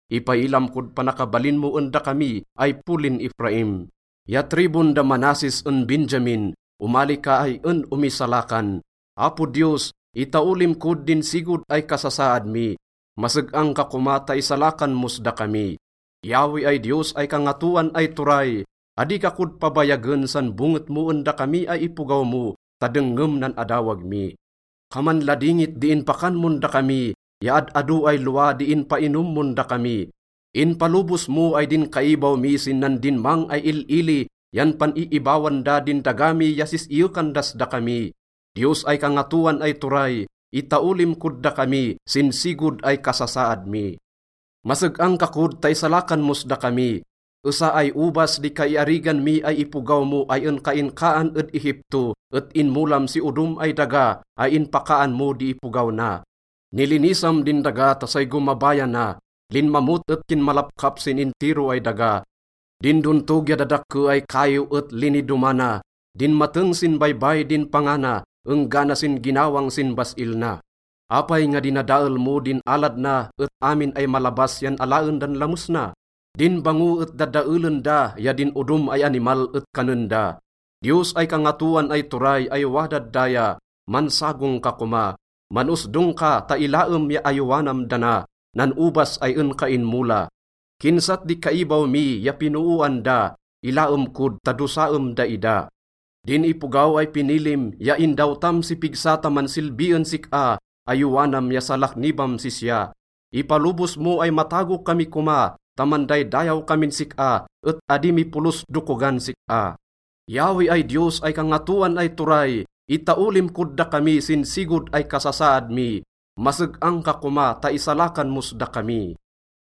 ipailam kod panakabalin mo en dakami ay polin Efraim ya tribun da Manasses en Benjamin, omali ka ay en omisalakan. Apo Diyos, itaolim kod din sigod ay kasasaad mi. Maseg-ang ka koma ta isalakan mos dakami. Yahweh ay Diyos ay Kangatoan ay Turay, adi ka kod pabayagen san bonget mo en dakami ay ipogaw mo ta dengngem nan adawag mi. Kaman ladingit di inpakan mon dakami ya ad-ado ay lowa di inpainom mon dakami. Inpalobos mo ay din kaibaw mi sin nandinmang ay il-ili yan pan-iibawan da din daga mi ya sis-iyekan das dakami. Diyos ay Kangatoan ay Turay, itaolim kod dakami sin sigod ay kasasaad mi. Maseg-ang ka kod ta isalakan mos dakami. Esa ay obas di kaiarigan mi ay ipogaw mo ay en ka inkaan ed Egipto, et inmolam si odom ay daga ay inpakaan mo di ipogaw na. Nilinisam din daga ta say gomabayana. Linmamot et kinmalapkap sin intiro ay daga. Din dontog ya dadakke ay kaiw et linidomana. Dinmateng sin baybay din panga na enggana sin ginawang sin bas-il na. Apay nga dinadael mo din alad na et amin ay malabas yan alaen dan lames na? Din bango et dadaelen da ya din odom ay animal et kanen da. Diyos ay Kangatoan ay Turay ay wadad daya, mansagong ka koma. Man-osdong ka ta ilaem ya ayowanam dana, nan obas ay en ka inmola. Kinsat di kaibaw mi ya pinooan da. Ilaem kod ta dosaem daida. Din ipogaw ay pinilim ya indawtam si pigsa ta mansilbi en sik-a, ayowanam ya salaknibam sisya. Ipalobos mo ay matago kami koma ta mandaydayaw kamin sik-a et adi mi polos dokogan sik-a. Yahweh ay Diyos ay Kangatoan ay Turay, itaolim kod dakami sin sigod ay kasasaad mi. Maseg-ang ka koma ta isalakan mos dakami.